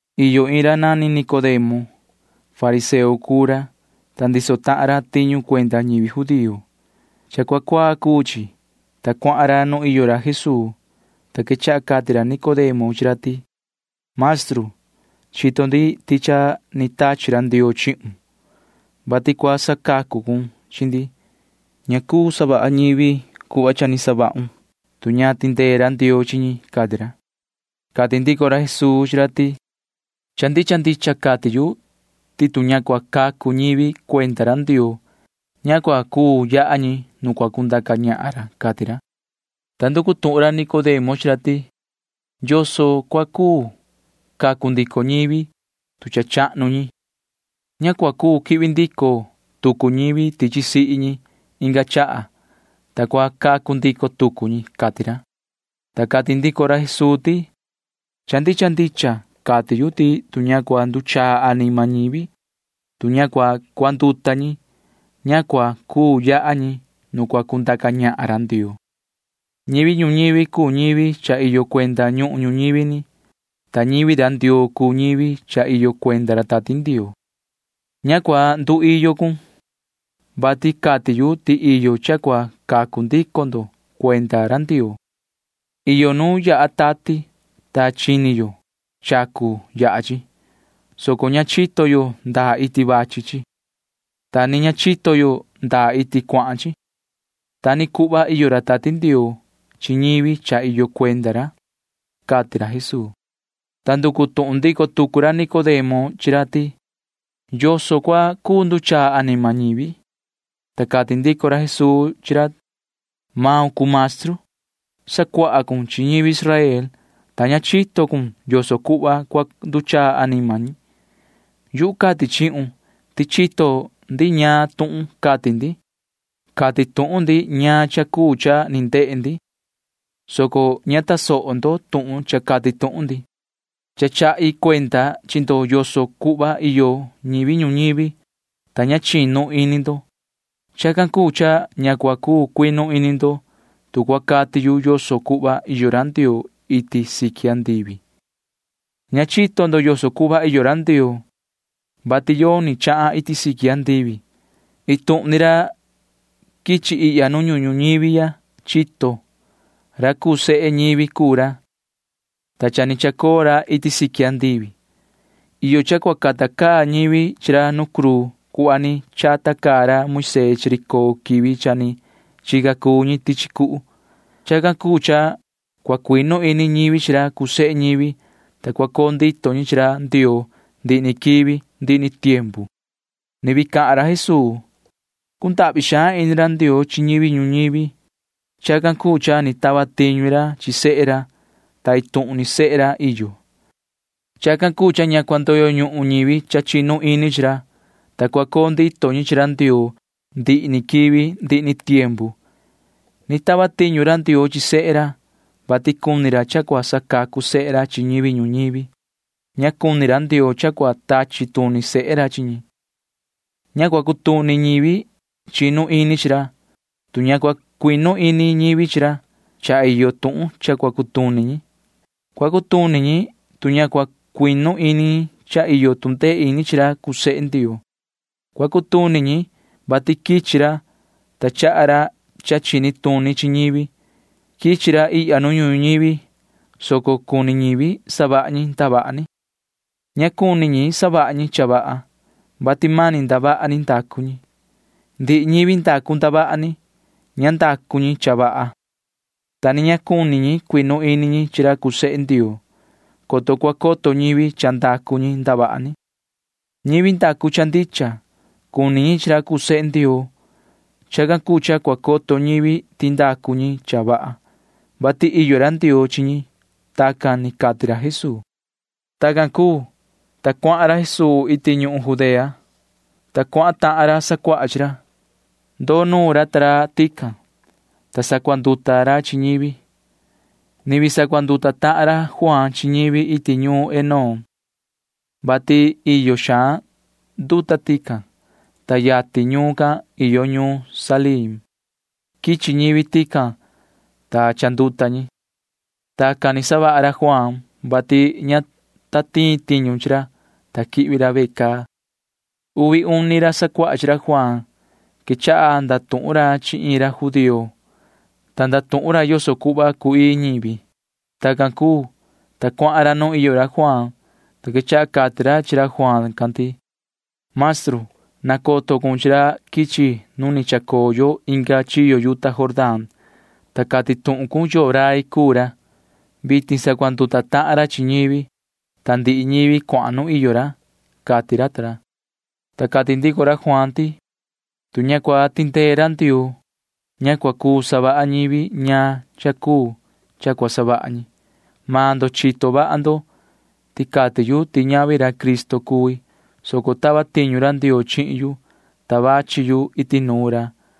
Iyo iin ra nani Nicodemo. Fariseo cuu ra, ta ndiso tahan ra tiñu cuenda ñivi judío. Cha cuaa cuu chi, ta cuahan ra nu iyo ra Jesuu, ta quechaha cati ra Nicodemo chi ra ti: ―Maestru, chito ndi ti cha ni tachi ra Ndioo chihun, vati cua sacuahun chi ndi. Ña cuu savaha ñivi cuhva cha ni savahun, tu ña tindee ra Ndioo chi ñi ―cati ra. Cati ndico ra Jesuu chi ra ti: ―Cha ndicha ndicha cati yu ti tu ña cua cacu ñivi cuenda ra Ndioo, ña cua cuu yaha ñi nu cua cundaca ñahan ra ―cati ra. Ta nducu tuhun ra Nicodemo chi ra ti: ―¿Yoso cua cuu cacu ndico ñivi, tu cha chahnu ñi? Ña cua cuu quihvi ndico tucu ñivi tichi sihi ñi inga chaha, ta cua cacu ndico tucu ñi ―cati ra. Ta cati ndico ra Jesuu ti: ―Cha ndicha ndicha cati yu ti tu ña cua nduchaa anima ñivi, tu ña cua cuanduta ñi, ña cua cuu yaha ñi nu cua cundaca ñahan ra Ndioo. Ñivi ñuñivi cuu ñivi cha iyo cuenda ñuhun ñuñivi ni, ta ñivi ra Ndioo cuu ñivi cha iyo cuenda ra Tati Ndioo. Ña cua nduiyo cun, vati cati yu ti iyo cha cua cacu ndico ndo cuenda ra Ndioo. Iyo nu yaha tati, ta chini yo cha cu yaha chi, soco ña chito yo ndaa iti vachi chi, ta ni ña chito yo ndaa iti cuahan chi. Ta ni cuhva iyo ra Tati Ndioo chi ñivi cha iyo cuenda ra ―cati ra Jesuu. Ta nducu tuhun ndico tucu ra Nicodemo chi ra ti: ―¿Yoso cua cuu nduchaa anima ñivi? Ta cati ndico ra Jesuu chi ra: ―Maun cuu maestru. Sacuaha cun chi ñivi Israel, ta ña chito cun yoso cuhva cua nduchaa anima ñi. Yuhu cati chihun ti chito ndi ñaan tuhun cati ndi. Cati tuhun ndi ñaan cha cuu cha ni ndehe ndi, soco ña tasoho ndo tuhun cha cati tuhun ndi. Cha chahi cuenda chi ndo yoso cuhva iyo ñivi ñuñivi, ta ña chinu ini ndo. Chacan cuu cha ña cua cuu cuinu ini ndo, tu cua cati yu yoso cuhva iyo ra Ndioo iti siqui andivi. ’[Ña chito ndo yoso cuhva iyo ra Ndioo,] vati yoni chahan iti siqui andivi. Iin tuhun ni ra quichi ihya nu ñuhun ñuñivi ya chito. Ra cuu sehe ñivi cuu ra, ta cha ni chacoo ra iti siqui andivi. Iyo cha cua cata caa ñivi chi ra nu cruu cuhva ni chata caa ra Moisee chi ri coo quivi cha ni chica cuu ñi tichi cuhu. Chacan cuu cha cua cuinu ini ñivi chi ra cuu sehe ñivi, ta cua coo ndito ñi chi ra Ndioo ndihi ni quivi ndihi ni tiempu. [Ni vii cahan ra Jesuu:] ’Cundahvi xaan ini ra Ndioo chi ñivi ñuñivi. Chacan cuu cha ni tava tiñu ra chi sehe ra, ta iin tuhun ni sehe ra iyo. Chacan cuu cha ña cua ndoyo ñuhun ñivi chinu ini chi ra, soco cua coo ndito ñi chi ra Ndioo ndihi ni quivi ndihi ni tiempu. Ni tava tiñu ra Ndioo chi sehe ra, vati cuni ra cha cua sacacu sehe ra chi ñivi ñuñivi. Ña cuni ra Ndioo cha cua tachi tuni sehe ra chi ñi. ’Ña cua cutuni ñivi chinu ini chi ra. Tu ña cua cuinu ini ñivi chi ra, cha iyo tuhun cha cua cutuni ñi. Cua cutuni ñi, vati ña cua cuinu ini ñi ti cha iyo tu ndee ini chi ra cuu sehe Ndioo. Cua cutuni ñi, vati quichi ra, ta chaha ra cha chini tuni chi ñivi. Quichi ra ihya nu ñuhun ñuñivi, soco cuni ñivi savaha ñi ndavaha ni. Ña cuni ñi savaha ñi cha vaha, vati mani ndavaha ni ndacu ñi. Ndihi ñivi ndacu ndavaha ni―ña ndacu ñi cha vaha, ta ni ña cuni ñi cuinu ini ñi chi ra cuu sehe Ndioo, coto cua coto ñivi cha ndacu ñi ndavaha ni. Ñivi ndacu cha ndicha―cuni ñi chi ra cuu sehe Ndioo. Chacan cuu cha cua coto ñivi ti ndacu ñi cha vaha, vati iyo ra Ndioo chi ñi. Tacan ni cati ra Jesuu. Tacan cuu, ta cuahan ra Jesuu iti ñuhun Judea, ta cuahan tahan ra sacuaha chi ra. Ndoo nuun ra ta ra tican, ta sacuanduta ra chi ñivi. Ni vii sacuanduta tahan ra Juaan chi ñivi iti ñuun Enón, vati iyo xaan nduta tican, ta yatin ñuun can iyo ñuun Salim. Quichi ñivi tican, ta cha ni chanduta ñi. Tacan ni savaha ra Juaan, vati ña ta tiin tiñu chi ra, ta quihvi ra ve caa. Uvi uni ra sacuaha chi ra Juaan―quechaha ndatuhun ra chi iin ra judío, ta ndatuhun ra yoso cuhva cu‑ii ñivi. Tacan cuu, ta cuahan ra nu iyo ra Juaan, ta quechaha cati ra chi ra Juaan can ti: ―Maestru, nacoto cun chi ra quichi nu ni chacoo yo inga chiyo yuta Jordán, ta cati tuhun cun yoo rai cuu ra. Vitin sacuanduta tahan ra chi ñivi, ta ndihi ñivi cuahan nu iyo ra ―cati ra ta ra. Ta cati ndico ra Juaan ti: ―Tu ña cua tindee ra Ndioo, ña cua cuu savaha ñivi ñaan cha cuu cha cua savaha ñi. Maan ndo chito vaha ndo ti cati yu ti ñavi ra Cristo cui, soco tava tiñu ra Ndioo chihin yu, ta quichi yu iti chata ra.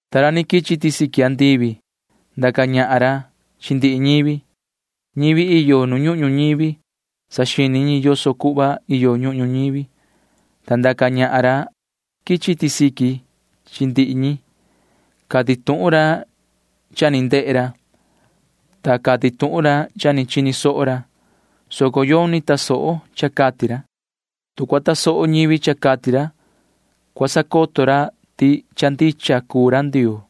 Ta ra ni quichi iti siqui andivi―ndaca ñahan ra chi ndihi ñivi. Ñivi iyo nu ñuhun ñuñivi―saxini ñi yoso cuhva iyo ñuhun ñuñivi, ta ndaca ñahan maan ra quichi iti siqui chi ndihi ñi. Cati tuhun ra cha ni ndehe ra, ta cati tuhun ra cha ni chini soho ra, soco yoni tasoho cha cati ra. Tu cua tasoho ñivi cha cati ra, cua sacoto ra ti cha ndicha cuu ra Ndioo.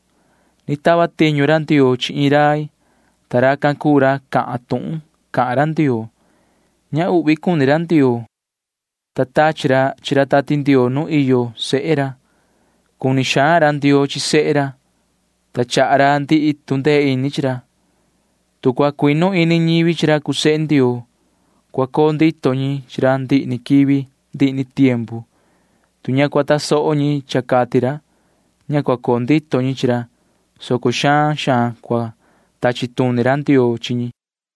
Ni tava tiñu ra chi iin rai, ta racan cuu ra cahan tuhun cahan ra Ndioo. Ña uhvi cuni ra Ndioo, ta tachi ra chi ra Tati Ndioo nu iyo sehe ra. Cuni xaan ra Ndioo chi sehe ra, ta chaha ra ndihi tu ndee ini chi ra. Tu cua cuinu ini ñivi chi ra cuu sehe Ndioo, cua coo ndito ñi chi ra ndihi ni quivi ndihi ni tiempu. Tu ña cua tasoho ñi cha cati ra, ña cua coo ndito ñi chi ra, soco xaan xaan cua tachi tuni ra Ndioo chi ñi.